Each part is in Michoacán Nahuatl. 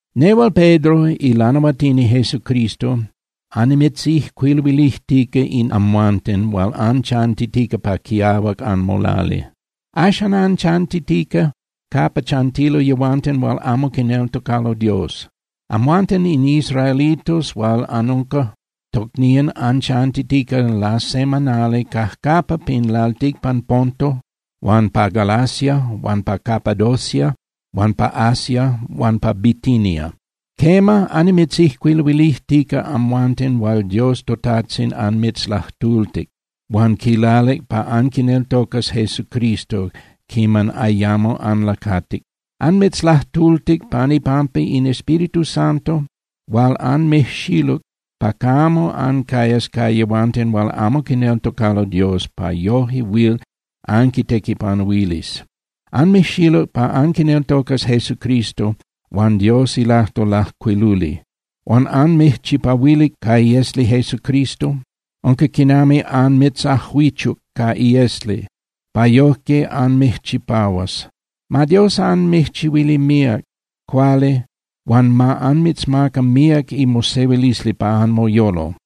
Nehual Pedro ilanahuatini Jesucristo annimitzijcuiluilijtica in amal amhuanten hual anchantitica pa quiahuac anmolali. Axan anchantitica capa chantilo yehuanten hual amo quineltocalo Dios. Amhuanten in israelitos hual anunca tocnían anchantitica lasemanali cajcapa pin lalticpan Ponto huan pa Galacia huan pa Capadocia huan pa Asia huan pa Bitinia. Quema, annimitzijcuiluilijtica amhuanten hual Dios toTajtzin anmitzlajtultic huan quilalic pa anquineltocas Jesucristo quiman ayamo anlacatic. Anmitzlajtultic pan ipampa in Espíritu Santo hual anmijxiluc pa camo ancayas ca yehuanten hual amo quineltocalo Dios pa yoje huil anquitequipanuilis. Anmijxiluc pa anquineltocas Jesucristo huan Dios ilajtol lajcuiluli, huan anmijchipahuilic ca iesli Jesucristo. Unca quinami anmitzajuichuc ca iesli pa yojque anmijchipahuas. Ma Dios anmijchihuili míac cuali huan ma anmitzmaca míac imosehuilisli pa anmoyolo.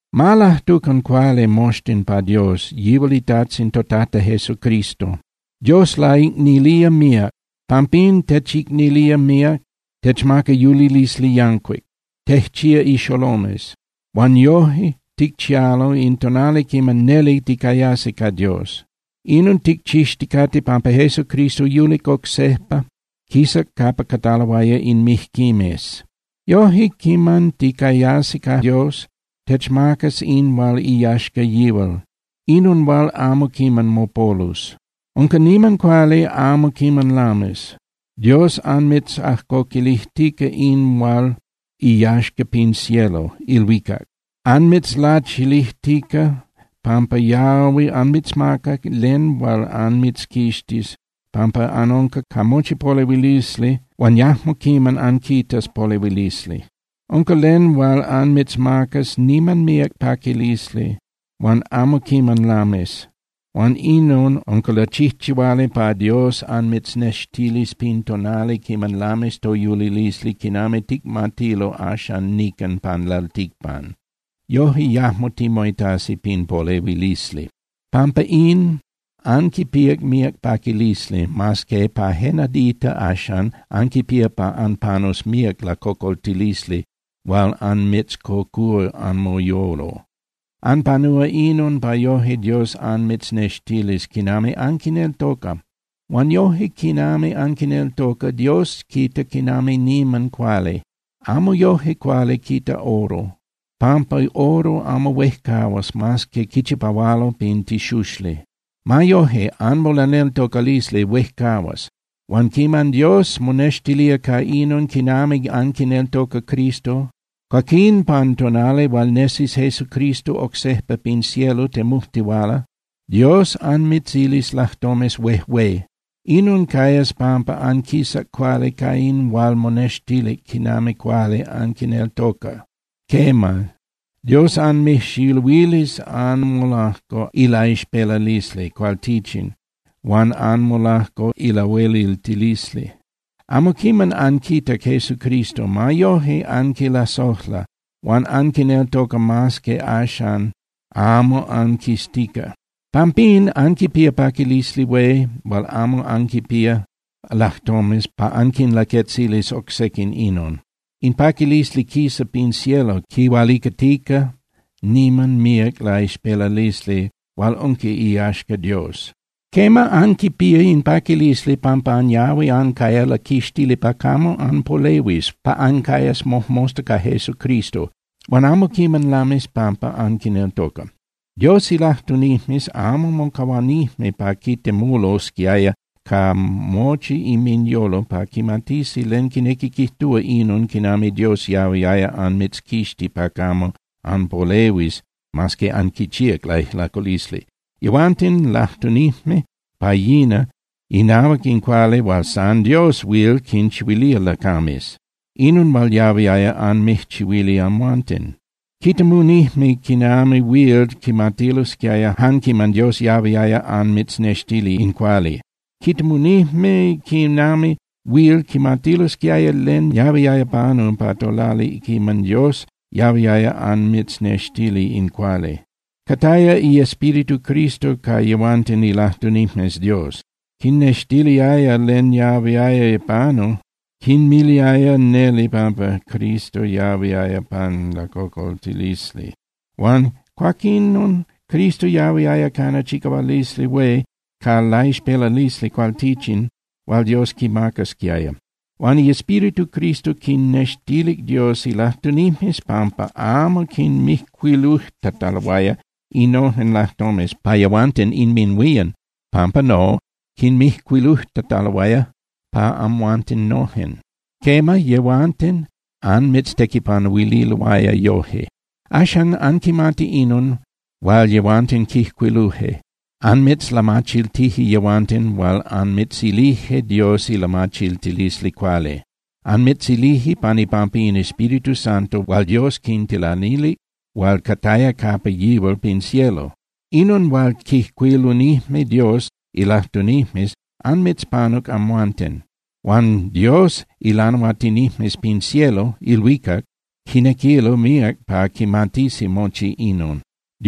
Ma lajtucan cuali moxtin pa Dios, yihual iTajtzin toTata Jesucristo. Dios laicnilía míac. Pampín techicnilía míac, techmaca yulilisli yancuic. Tejchía ixolomes, huan yoje ticchialo in tonali quiman neli ticayasi ca Dios. Inon ticchixticate pampa Jesucristo yulic oc sejpa, quisac capa cataloaya in mijquimes. Yoje quiman ticayasi ca Dios, techmacas in hual iyaxca yihual, inon hual amo quiman mopolus. Unca niman cuali, amo quiman lamis. Dios anmitzajcoquilijtica in hual iyaxca pin cielo (ilhuicac). Anmitzlachilijtica pampa yahui anmitzmaca len hual anmitzquixtis capa anunca ca mochi polehuilisli huan yajmo quiman anquitas polehuilisli. Unca len hual anmitzmacas niman míac paquilisli huan amo quiman lamis. Huan inon unca lachijchihuali pa Dios anmitznextilis pin tonali quiman lamis toyulilisli quinami ticmatilo axan nican pan lalticpan. Yoje yajmo timoitasi pin polehuilisli. Pampa in, anquipíac míac paquilisli, mas que pa je nadita axan, anquipía pa anpanus míac lacocoltilisli hual anmitzcocúa anmoyolo. Anpanúa inon pa yoje Dios anmitznextilis quinami anquineltoca. Huan yoje quinami anquineltoca, Dios quita quinami niman cuali. Amo yoje cuali quita oro, pampa oro amo huejcahuas mas que quichipahualo pin tixuxli. Ma yoje, anmolaneltocalisli huejcahuas. Huan quiman Dios monextilía ca inon quinami anquineltoca Cristo, cuaquín pan tonali hual nesis Jesucristo oc sejpa pin cielo temujtihuala, Dios anmitzilis lajtomes huejué. Inon cayas pampa anquisac cuali ca in hual monextilic quinami cuali anquineltoca. Quema, Dios anmijxiluilis anmolajco ilaixpelalisli cualtichin huan anmolajco ilahueliltilisli. Amo quiman anquitac Jesucristo. Ma yoje anquilasojla, huan anquineltoca mas que axan amo anquiztica. Pampín anquipía paquilisli hué hual amo anquinpía lajtomes pa anquinlaquetzilis oc sequin inon. In paquilisli quisa pin cielo quihualicatica niman míac laixpelalisli hual unca iyaxca Dios. Quema, anquipía in paquilisli pampa anyahui ancaya laquixtili pa camo anpolehuis, pa ancayas mojmosta ca Jesucristo. Huan amo quiman lamis pampa anquineltoca. Dios ilajtunijmes amo mocahuanijme pa quitemulosquiaya ca mochi inminyolo pa quimatisi len quinequi quijtúa inon quinami Dios yahuiaya anmitzquixti pa camo anpolehuis mas que anquichíac laijlaculisli. Yehuanten lajtunijme pa yina inahuac in cuali hual san Dios huil quinchihuilía lacames, inon hual yahuiaya anmijchihuili amhuanten. Quitemunijme quinami huil quimatilosquiaya jan quiman Dios yahuiaya anmitznextili in cuali. Quitemunijme quinami huil quimatilosquiaya len yahuiaya panu pa tolali quiman Dios yahuiaya anmitznextili in cuali. Cataya iEspíritu Cristo ca yehuanten ilajtunijmes Dios. Quinnextiliaya len yahuiaya panu. Quinmiliaya neli pampa Cristo yahuiaya panu lacocoltilisli huan cuaquinon Cristo yahuiaya cana chicahualisli hué ca laixpelalisli cualtichin hual Dios quimacasquiaya. Huan iEspíritu Cristo quinnextilic Dios ilajtunijmes pampa amo quinmijcuilujtataloaya innojen lajtomes pa yehuanten inminhuían, pampa no, quinmijcuilujtataloaya pa amhuanten nojen. Quema, yehuanten anmitztequipanuililoaya yoje. Axan, anquimati inon hual yehuanten quijcuiluje. Anmitzlamachiltije yehuanten hual anmitzilije Dios ilamachiltilisli cuali. Anmitzilije pan ipampa in Espíritu Santo hual Dios quintilanilic hual cataya capa yihual pin cielo. Inon hual quijcuilunijme Dios ilajtunijmes anmitzpanuc amhuanten. Huan Dios ilanahuatinijmes pin cielo (ilhuicac) quinequilo míac pa quimatisi mochi inon.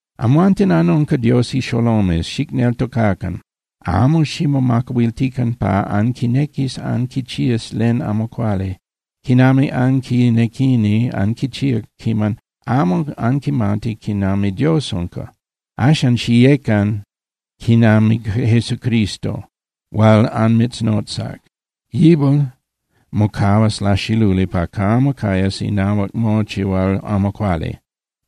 Amhuanten anunca Dios ixolomes. Xicneltocacan, amo ximomacahuiltican pa anquinequis anquichías len amo cuali, quinami anquinequini anquichía quiman amo anquimatic quinami Dios unca. Axan, xiyecan quinami Jesucristo hual anmitznotzac. Yihual mocahuas laxiluli pa camo cayas inahuac mochi hual amo cuali.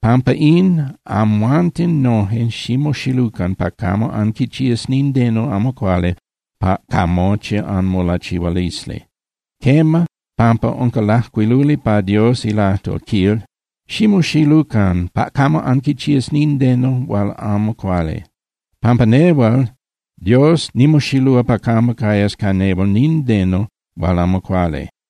Pampa in, amhuanten noje ximoxilucan pa camo anquichías nindeno amo cuali ca mochi anmolachihualisli. Quema, pampa unca lajcuiluli pa Dios ilajtol, quil: “Ximoxilucan pa camo anquichías nindeno hual amo cuali, pampa nehual Dios nimoxilúa pa camo cayas ca nehual nindeno hual amo cuali.”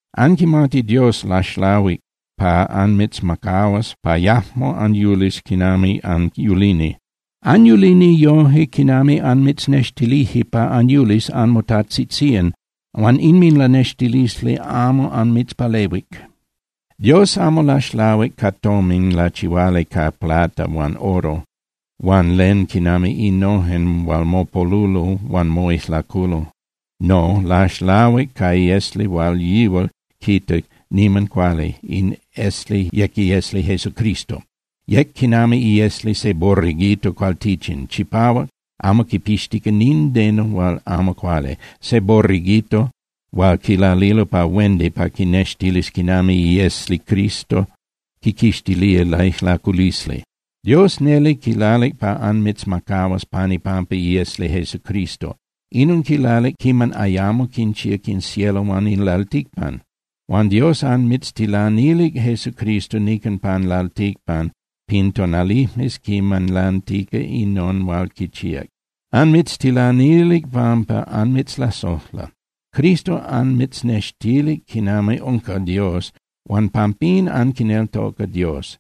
Anquimati Dios laxlahuic pa anmitzmacahuas pa yajmo anyulis quinami anyulini. Anyulini yoje quinami anmitznextilije pa anyulis anmotajtzitzían huan inminlanextilisli amo anmitzpalehuic. Dios amo laxlahuic ca tomin lachihuali ca plata huan oro huan len quinami innojen hual mopolulo huan moijlaculo. No, laxlahuic ca esli hual yihual quita niman cuali. In esli yec iesli Jesucristo. Yec quinami iesli se borreguito cualtichin, chipahuac, amo quipixtica nindeno hual amo cuali, se borreguito hual quilalilo pa huendi pa quinextilis quinami iesli Cristo quiquixtilía laijlaculisli. Dios neli quilalic pa anmitzmacahuas pan ipampa iesli Jesucristo. Inon quilalic quiman ayamo quinchíac in cielo huan in lalticpan. Huan Dios anmitztilanilic Jesucristo nican pan lalticpan pin tonalijmes quiman lantica inon hual quichíac. Anmitztilanilic pampa anmitzlasojla. Cristo anmitznextilic quinami unca Dios huan pampín anquineltoca Dios.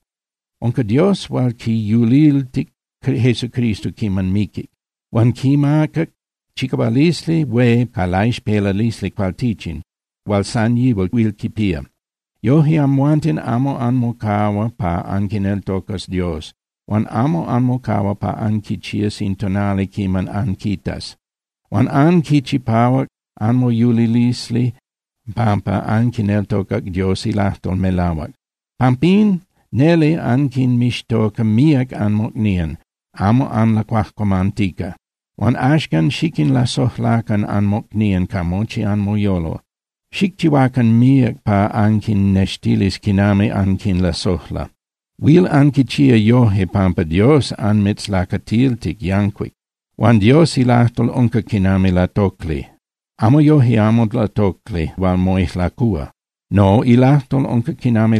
Unca Dios hual quiyuliltic Jesucristo quiman miquic. Huan quimacac chicahualisli hué ca laixpelalisli cualtichin hual san yihual huil quipía. Yoje, amhuanten amo anmocahua pa anquineltocas Dios huan amo anmocahua pa anquichías in tonali quiman anquitas. Huan anquichipahuac anmoyulilisli pampa anquineltocac Dios ilajtol melahuac. Pampín neli anquinmixtoca míac anmocnían, amo anlacuajcuamantica. Huan axcan xiquinlasojlacan anmocnían ca mochi anmoyolo. Xicchihuacan míac pa anquinnextilis quinami anquinlasojla. Huil anquichía yoje pampa Dios anmitzlacatiltic yancuic. Huan Dios ilajtol unca quinami latocli, ma yoje amo latocli hual moijlacúa. No, ilajtol unca quinami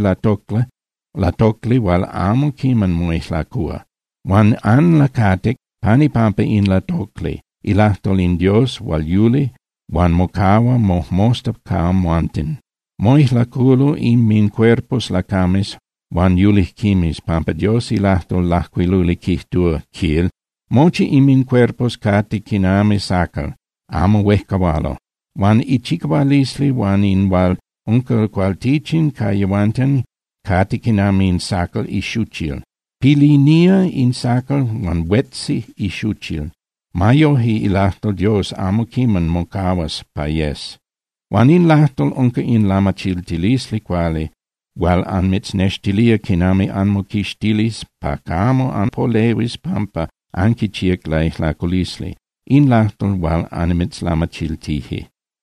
latocli hual amo quiman moijlacúa. Huan anlacatic pan ipampa in latocli, ilajtol in Dios hual yuli huan mocahua mojmosta ca amhuanten. Moijlaculo inmincuerpos lacames huan yulijquimes, pampa Dios ilajtol lajcuiluli quijtúa, quil: Mochi inmincuerpos cate quinami sacal, amo huejcahualo, huan ichicahualisli huan in hual unca cualtichin ca yehuanten cate quinami in sacal ixuchil. Pilinía in sacal huan huetzi ixuchil. Ma yoje, ilajtol Dios amo quiman mocahuas pa yes. Huan in lajtol unca in lamachiltilisli cuali hual anmitznextilía quinami anmoquixtilis pa camo anpolehuis pampa anquichíac laijlaculisli. In lajtol hual anmitzlamachiltije.